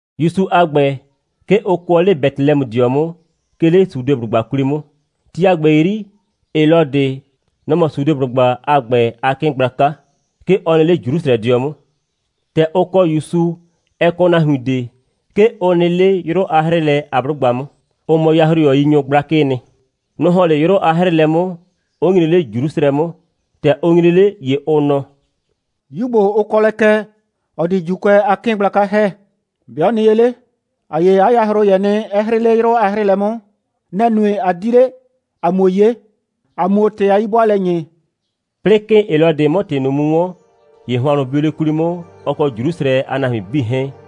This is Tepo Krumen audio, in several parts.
‑Yusu a ‑gbɛ, 'ke ʋ kʋɔ 'le Betelɛmʋdɩɔ 'mʋ, 'ke 'le Sudeblʋgba 'kwli 'mʋ. Ti a ‑gbɛ 'yri, Helɔdɩ, nɔ‑ mɔ Sudeblʋgba a ‑gbɛ a 'kɩɩn gblaka. 'Ke ɔ nɩ 'le Jrusrɛdɩɔ 'mʋ. ‑Tɛ ʋ kɔ ‑Yusu, ɛ kɔ nahuin ꞊de, 'ke ʋ nɩ 'le 'yrʋ a 'hrɩɩlɛ a 'blʋgba 'mʋ. Ʋ mɔ yahroyɔyinyʋ gblakɩɩ nɩ. Nʋ‑ ‑hɔn 'le 'yrʋ a 'hrɩɩlɛ 'mʋ, 'ʋ nyre 'le Jrusrɛ 'mʋ. ‑Tɛ ʋ nyre 'le, ‑ye ʋ nɔ: «'Yu ‑gbo, ʋ kɔ lɛ kɛ, ‑ɔ di ‑Juukʋɛ a 'kɩɩn gblaka ‑hɛ, ‑be' ɔ nɩ ye 'le? ‑A 'ye 'a yahroyɛ nɩ, 'ɛ 'hrɩɩ 'le 'yrʋ a 'hrɩɩlɛ 'mʋ. Nɛ‑ nue, ꞊a di 'le, ‑a 'muo 'ye, ‑a 'muo ‑tɩ a 'yi'bʋaalɛ ‑nyi.» 'Plɩɩ 'kɩɩn Helɔdɩ 'mʋ ‑tɩ ꞊nʋ mu 'wɔn, ‑ye hʋannʋ bio 'le 'kwli 'mʋ, ɔ kɔ Jrusrɛ a nahuin 'bii 'hɛɛn,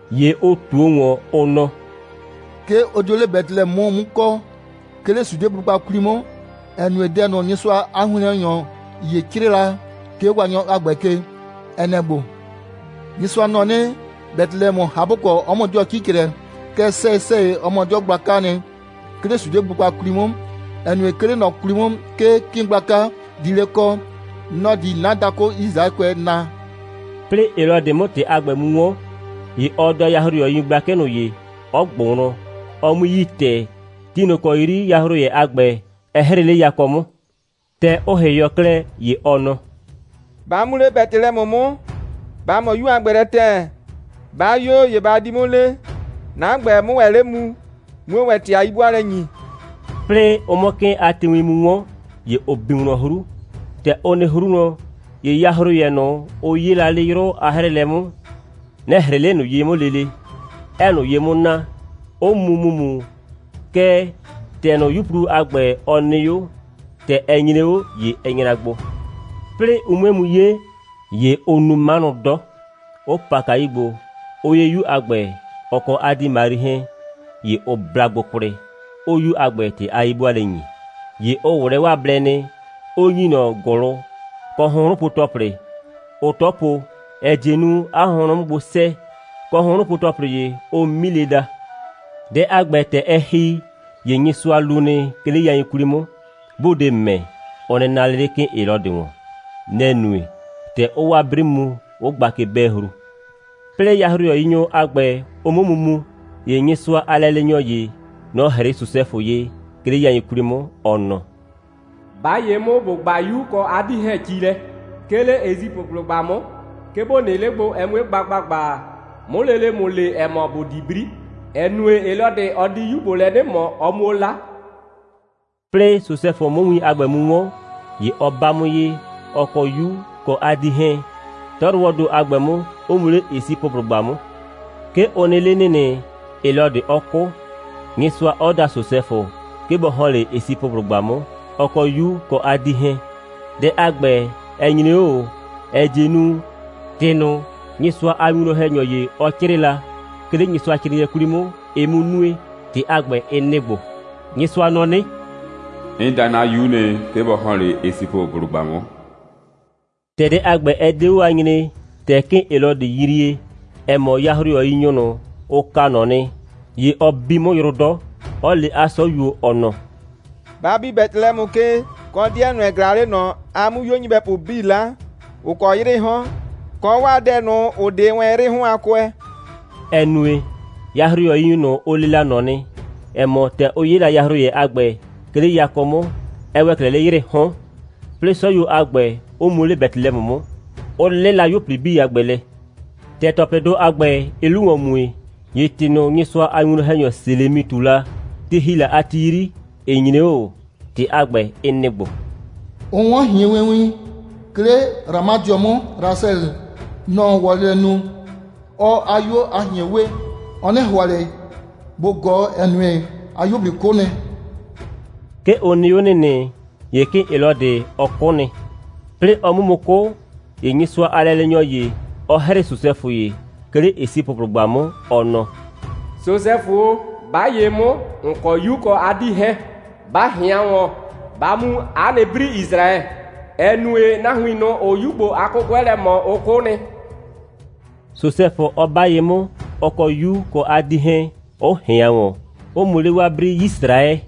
‑Ye ʋ ꞊tuo ‑wɔn, ʋ nɔ: «'Ke ʋ dio 'le Betelɛmʋ 'mʋ kɔ, 'ke 'le Sudeblʋgba 'kwli 'mʋ, ‑ɛ nue, dɛ ꞊nʋ, Nyɩsʋa a winwlɔn‑hɛnyɔ ‑ye 'crɩɩ la, 'ke 'o Waanyɔ a ‑gbɛ ke, ɛ nɛ‑ ‑gbo: Nyɩsʋa nɔ 'nɩ: Betelɛmʋ, ꞊hapʋkɔ, 'ɔ mɔ 'dɩɔ 'cicrɛ, kɛɛ, sɛyɩ‑sɛyɩ, ɔ mɔ 'dɩɔ gblakaa nɩ, 'ke 'le Sudeblʋgba 'kwli 'mʋ, ‑ɛ nue, 'ke 'le ꞊nɔ 'kwli 'mʋ, 'ke 'kɩɩn gblaka di 'le kɔ. Nɔ‑ di 'na dakʋ Yisraɛkʋɛ naa.» 'Plɩɩ Helɔdɩ 'mʋ ‑tɩ a ‑gbɛ mu 'wɔn, ‑ye ɔ da yahroyɔyinyʋ gblakɩ ꞊nʋ ye, 'ɔ ꞊gbʋ wlɔn, ɔ 'mui yi ‑tɛɛ, ti ꞊nʋ ‑kɔ 'yri yahroyɛ a ‑gbɛ, ɛ 'hrɩɩ 'le yakɔ 'mʋ. ‑Tɛ ʋ ‑hɩhɩɔ klɛ, ‑ye ɔ nɔ: «Ba mu 'le Betelɛmʋ 'mʋ, ba ꞊mɔ 'yu a ‑gbɛ lɛ ‑tɛɛ. 'Ba 'yo, ‑ye ba di 'mʋ le, 'na ‑gbɛ, 'mʋ 'le mu, 'muo ‑wɛ ‑tɩ a 'yi'bʋaalɛ ‑nyi.» 'Plɩɩ ʋ 'mʋ 'kɩɩn a tiiwin mu 'wɔn, ‑ye ʋ bi wlɔn 'hru. ‑Tɛ ʋ nɩ 'hru wlɔn, ‑ye yahroyɛ ꞊nʋ, ʋ 'yee la 'le 'yrʋ a 'hrɩɩlɛ 'mʋ, nɛ‑ 'hrɩɩ 'le ꞊nʋ ye 'mʋ lele, 'ɛɛ ꞊nʋ ye 'mʋ naa, 'ʋ mu ‑mumu. Kɛɛ, ‑tɛ ꞊nʋ, 'yuplu a ‑gbɛ, ɔ nɩ 'o, ‑tɛ ɛ nyre 'o, ‑ye ɛ nyra gbo. 'Plɩɩ ʋ 'mue mu 'ye, ‑ye ʋʋ nu 'manʋ 'dɔ, 'ʋ pa kayu gbo, 'ʋ 'ye 'yu a ‑gbɛ, ɔ kɔ 'a 'dii Mari 'hɛɛn. ‑Ye ʋ bla gbo kwlɩ, 'ʋʋ 'yu a ‑gbɛ ‑tɩ a 'yi'bʋaalɛ ‑nyi. ‑Ye ʋ ꞊wlɛɛ 'waa blɛ nɩ, 'ʋ ‑nyi ꞊nɔ ‑gʋlʋ, kɔ hʋnhrʋnpo‑tɔplɩ, ʋʋ 'tɔ po, ‑ɛ die nu, 'a hʋnhrʋn 'mʋ gbo 'sɛɛ, kɔ hʋnhrʋnpo‑tɔplɩ ‑ye, ʋʋ milɩ daa. Dɛ a ‑gbɛ, ‑tɛ ɛ ‑hi, ‑ye Nyɩsʋa lu nɩ, 'ke 'le yain 'kwli 'mʋ, 'bʋʋ de ‑mɛ, ʋ nɩ naa 'le 'le 'kɩɩn Helɔdɩ ‑wɔn. Nɛ‑ nue, ‑tɛ ʋʋ 'waa 'bri mu, 'ʋ gba ke'bɛɛhru. 'Plɩɩ yahroyɔyinyʋ a ‑gbɛ, ʋ 'mʋ mu mu, ‑ye Nyɩsʋa a lɛleenyɔ ‑ye, nɔ‑ 'hrɩɩ Sosɛfʋ ye, 'ke 'le yain 'kwli 'mʋ, ɔ nɔ: «'Ba ye 'mʋ, ‑bo 'gbaa 'yu, ɔ kɔ 'a 'dii 'hɛɛn ci lɛ, 'ke 'le Esipʋblʋgba 'mʋ, 'ke ‑bo nɩ 'le, ɛ 'mue gba ‑gbagba, 'mʋ lele ‑mʋ le, ‑ɛ mɔ, ‑bo di 'bri, ‑ɛ nue, Helɔdɩ, ɔ di 'yu ‑gbo lɛ 'nɩ ꞊mɔ, ɔ 'muo 'la.» 'Plɩɩ Sosɛfʋ 'mʋ win a ‑gbɛ mu 'wɔn, ‑ye ɔ 'ba 'mʋ ye, ɔ kɔ 'yu, kɔ 'a 'dii 'hɛɛn, 'tɔyrʋwɔɔ ‑do a ‑gbɛ 'mʋ, 'ʋ mu 'le Esipʋblʋgba 'mʋ. 'Ke ʋ nɩ 'le ‑nɩnɩ, Helɔdɩ 'ɔ 'kʋ, Nyɩsʋa 'ɔ da Sosɛfʋ, 'ke bɔ ‑hɔn 'le Esipʋblʋgba 'mʋ, ɔ kɔ 'yu kɔ 'a 'dii 'hɛɛn. Dɛ a ‑gbɛ, ɛ nyre 'o ꞊o, ‑ɛ die nu, ‑tɩ ꞊nʋ, Nyɩsʋa a winwlɔn‑hɛnyɔ ‑ye, ɔ 'crɩɩ la, 'ke 'le Nyɩsʋacrɩɩnɩɛ 'kwli 'mʋ, ɩ 'mʋ nue. ‑Tɩ a ‑gbɛ, ɩ nɩ‑ ‑gbo: «Nyɩsʋa nɔ 'nɩ: 'N da 'na 'yu nɩ, 'ke bɔ ‑hɔn 'le Esipʋblʋgba 'mʋ.» ‑Tɛ dɛ a ‑gbɛ, ɛ 'de 'o a nyree, ‑tɛ 'kɩɩn Helɔdɩ yrie, ‑ɛ mɔ, yahroyɔyinyʋ ꞊nʋ, ʋ kaa ꞊nɔ nɩ, ‑ye ɔ bi 'mʋ yrʋ 'dɔ, 'ɔ le 'a 'sɔyuo, ɔ nɔ: «Ba bi Betelɛmʋ ke, kɔ 'dɩɛ ꞊nʋ, ‑ɛ ꞊glaa 'le ꞊nɔ, a 'mʋ 'yuo nyɩbɛpʋ 'bii 'la, ‑ʋ kɔ 'yrɩɩ 'hɔn, kɔ 'waa dɛ ꞊nʋ, ‑ʋ 'de wɛn 'yrɩɩ 'hɔn a kʋɛ,» ‑ɛ nue, yahroyɔyinyʋ ꞊nʋ, ʋ le la ꞊nɔ nɩ, ‑ɛ mɔ, ‑tɛ ʋ 'ye la yahroyɛ a ‑gbɛ, 'ke 'le yakɔ 'mʋ, ɛ ‑wɛ 'klɛɛ 'le 'yrɩɩ 'hɔn. 'Plɩɩ 'sɔyuo a ‑gbɛ, 'ʋ mu 'le Betelɛmʋ 'mʋ, 'ʋ 'lɩla 'yuo꞊pli a ‑gbɛ lɛ. ‑Tɛ ‑tɔplɩdʋ a ‑gbɛ, ɩɩ 'lu ‑wɔn mue, ‑ye ‑tɩ ꞊nʋ, Nyɩsʋa a winwlɔn‑hɛnyɔ Selemi ꞊tu la, ti ‑hi la a ti 'yri, ɩ nyre 'o ꞊o. ‑Tɩ a ‑gbɛ, ɩ nɩ‑ ‑gbo: «Ʋ 'wɔn ꞊hienwewin, 'ke 'le Ramadɩɔ 'mʋ. Rasɛlɩ, nɔ‑ɔ wɔlɩ lɛ nu, 'ɔɔ 'a 'yuo a ꞊hien we. Ɔ 'nɩ ‑hʋa ꞊le bʋ ꞊gɔɔ, ‑ɛ nue, 'a 'yuo꞊pli 'kʋ nɩ.» 'Ke ʋ nɩ 'o ‑nɩnɩ, ‑ye 'kɩɩn Helɔdɩ, ɔ 'kʋ nɩ. 'Plɩɩ ɔ 'mʋ mu 'kʋ, ‑ye Nyɩsʋa a lɛleenyɔ ‑ye, ɔ 'hrɩɩ Sosɛfʋ ye, 'ke 'le Esipʋblʋgba 'mʋ, ɔ nɔ: «Sosɛfʋ o, 'ba ye 'mʋ, ‑n kɔ 'yu kɔ 'a 'dii 'hɛɛn, ba ꞊hɩan ‑wɔn, ba mu 'a nɩ 'bri Yisraɛ, ‑ɛ nue, nahuin ꞊nʋ, ‑ʋʋ 'yu ‑gbo a 'kʋkʋɛ lɛ ꞊mɔ, ʋ 'kʋ nɩ,» Sosɛfʋ 'ɔ 'ba ye 'mʋ, ɔ kɔ 'yu kɔ 'a 'dii 'hɛɛn, 'ʋ ꞊hɩan ‑wɔn, 'ʋ mu 'le 'waa 'bri Yisraɛ.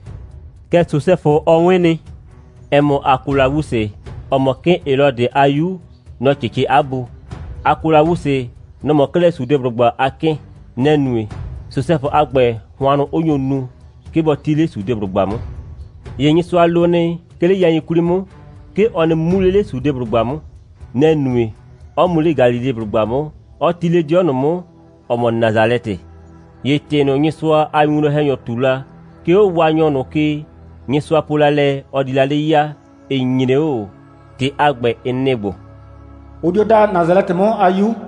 Kɛɛ, Sosɛfʋ, ɔ 'wɩn nɩ, ‑ɛ mɔ, Akolawusɩ, ‑ɔ mɔ 'kɩɩn Helɔdɩ a 'yu, nɔ‑ 'cɩcɩ 'a bu. Akolawusɩ, nɔ‑ mɔ 'klɛɛ Sudeblʋgba a 'kɩɩn. Nɛ‑ nue, Sosɛfʋ a ‑gbɛ, hʋannʋ 'ʋ nyo nu, 'ke bɔ 'ti 'le Sudeblʋgba 'mʋ. ‑Ye Nyɩsʋa lo nɩ, 'ke 'le yain 'kwli 'mʋ, 'ke ɔ nɩ mu 'le 'le Sudeblʋgba 'mʋ. Nɛ‑ nue, 'ɔ mu 'le Galileblʋgba 'mʋ, 'ɔ 'ti 'le 'dɩɔ ꞊nʋ 'mʋ, ‑ɔ mɔ Nasalɛtɩ. ‑Ye ‑tɩ ꞊nʋ, Nyɩsʋa a winwlɔn‑hɛnyʋ ꞊tu la, 'ke 'o Waanyɔ ꞊nʋ ke, Nyɩsʋa po la lɛ, ɔ di la 'le ya, ɩ nyre 'o ꞊o. ‑Tɩ a ‑gbɛ, ɩ nɩ‑ ‑gbo: «Ʋ dio daa Nasalɛtɩ 'mʋ a 'yu.»